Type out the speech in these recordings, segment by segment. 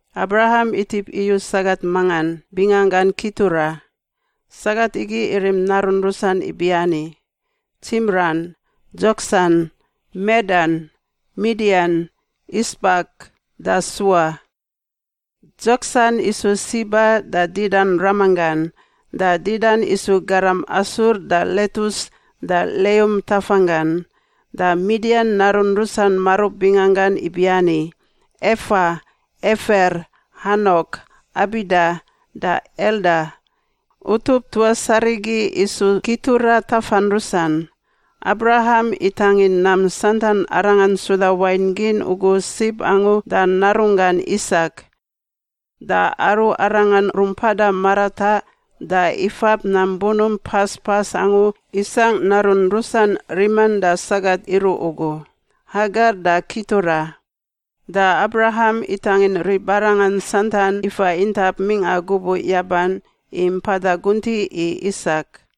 Abraham itip iyu sagat mangan, binganggan Kitura. Sagat igi irim narun rusan ibiani, Tsimran, Dzoksan, Medan, Midian, Isbak da Sua. Dzoksan isu Siba da Didan ramanggan. Da Didan isu garam Asur da Letus da Leum tafanggan. Da Midian narun rusan marub binganggan ibiani, Efa, Efer, Hanok, Abida da Elda. Utup tuas arigi isu Kitura tafan rusan. Abraham itangin nam santan arangan suda wain gin ugu sib angu da narunggan Isak. Da aru arangan rumpada marataꞌ da ifab nam bunump pas pas angu isangꞌ narun rusan riman da sagat iruꞌ ugu, Hagar da Kitura. Da Abraham itangin ribarangan santan ifa intap mingꞌa gubuꞌ yaban i mpada guntiꞌ i Isak.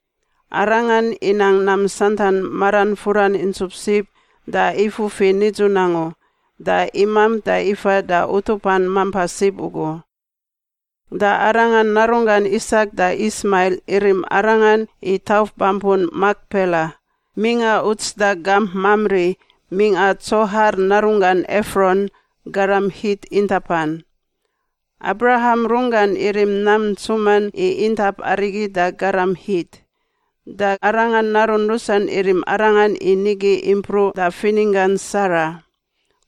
Arangan inang nam santan maran furan intsup sib da ifufi nidzun angu da imamp da ifa da utupan mampa sib ugu. Da arangan narunggan Isak da Ismail irim arangan i tauf bampun Makpela mingꞌa uts da gamp Mamri, mingꞌa Tsohar narunggan Efron, garam Hit, intapan. Abraham runggan irim nam ntsuman i intap arigi da garam Hit. Da arangan narun rusan irim arangan i nigi impruꞌ da fininggan Sara.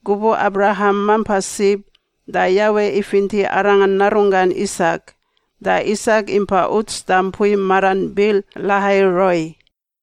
Gubuꞌ Abraham mampa sib, da Yawe ifinti arangan narunggan Isak. Da Isak impa uts da mpui maran Bir-Lahai-Roi.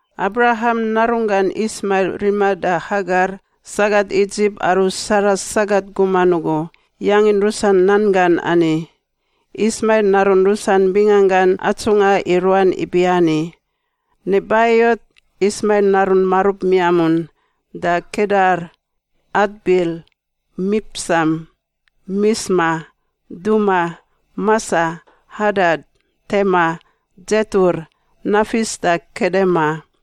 Abraham narunggan Ismail rima da Hagar, sagat Idzip aru Sara sagat guman ugu, yangin rusan nan gan ani. Ismail narun rusan bingangan atsungꞌa i ruan ibiani: Nebaiot, Ismail narun marub miamun, da Kedar, Adbil, Mipsam, Misma, Duma, Masa, Hadat, Tema, Dzetur, Nafis da Kedema.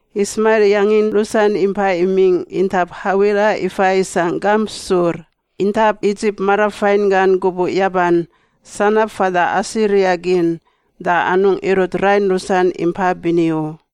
Ismail yangin rusan impai imingꞌ intap Hawila ifa isangꞌ gamp Sur, intap Idzip marafain gan gubuꞌ yaban, sanab fada Asiria gin. Da anungꞌ irut rain rusan impa bini u.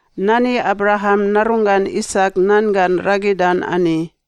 Nani Abraham narunggan Isak nan gan ragidan ani.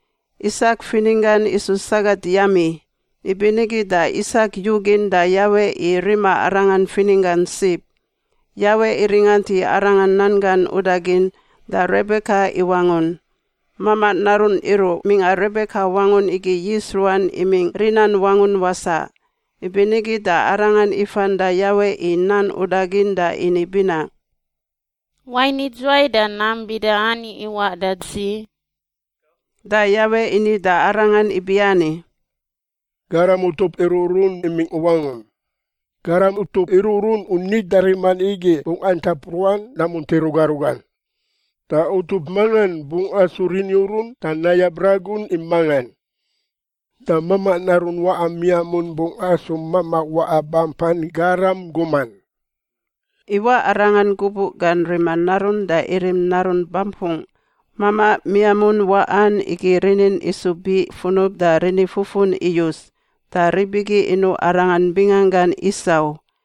Isak fininggan isu sagat yami, ibinigi da Isak yugin da Yawe i rima arangan fininggan sib. Yawe iringant i arangan nan gan udagin da Rebeka iwangun. Mamaꞌ narun iruꞌ mingꞌa Rebeka wangun igi yis ruan imingꞌ rinan wangun wasaꞌ. Ibinigi da arangan ifan da Yawe i nan udagin da ini binaꞌ, “Wain idzuwai da nam bida ani iwaꞌ da dzi?” Da Yawe ini da arangan ibiani, “Garam utup iruꞌrun imingꞌ u wangum. Garam utup iruꞌrun u nida riman igi bungꞌ antap ruan namunti ruga rugan. Da utup mangan bungꞌ asu riniurun da nayab ragun i mangan. Da mamaꞌ narun waꞌa miamun bungꞌ asu mamaꞌ waꞌa bampan garam guman.” Iwaꞌ arangan gubuꞌ gan rima narun da irim narun bampungꞌ. Mamaꞌ miamun waꞌan igi rinin isu biꞌ funub da rinifufun iyus, da rib igi inuꞌ arangan binganggan Isau.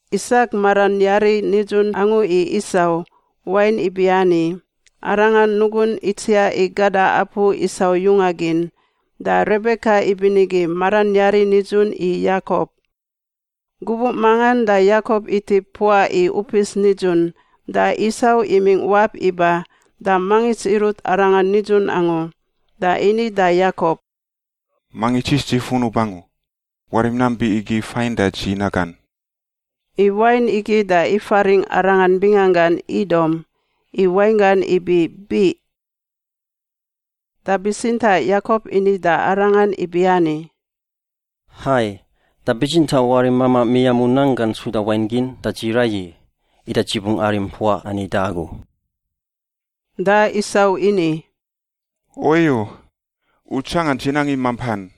Isak maran yari nidzun angu i Isau, wain ibiani, arangan nugun itsiaꞌ i gada apu Isau yunga gin. Da Rebeka ibinigi maran yari nidzun i Yakop. Gubuꞌ mangan da Yakop itip mpuaꞌ i upis nidzun, da Isau imingꞌ wap iba da mangits irut arangan nidzun angu, da ini da Yakop, “Mangits yis dzi funub angu! Warim nam biꞌ igi fain da dzi nagan!” (I wain igi da ifaringꞌ arangan binganggan Idom, i wainggan ibi biꞌ.) Da bitsintaꞌ Yakop ini da arangan ibiani, “Hai, da bitsintaꞌ warim mamaꞌ miamun nanggan suda wain gin da dzi raiyi, ida dzi bungꞌ arim mpuaꞌ ani da agu.” Da Isau ini, “Oiyo! U tsangan dzi nang i mampan!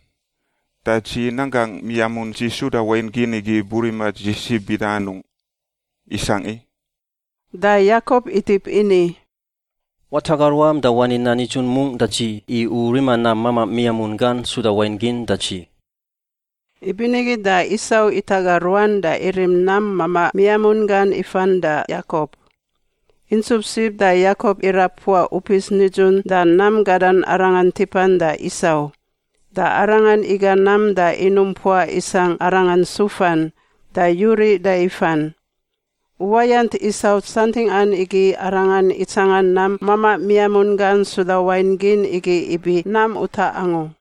Da dzi nanggangꞌ miamun dzi suda wain gin igi burima dzi sib bida anungꞌ? Isangꞌ i!” Da Yakop itip ini, “Wataga ruam da wani nan nidzun mungꞌ da dzi i u rima nam mamaꞌ miamun gan suda wain gin da dzi.” Ibinigi da Isau itaga ruan da irim nam mamaꞌ miamun gan ifan da Yakop. Intsup sib da Yakop irab mpuaꞌ upis nidzun da nam gadan arangan tipan da Isau. Da arangan iga nam da inum mpuaꞌ isangꞌ arangan sufan, da yuriꞌ da ifan. Uwayant Isau santingꞌan igi arangan itsanga nam mamaꞌ miamun gan suda wain gin igi ibi nam utaꞌ angu.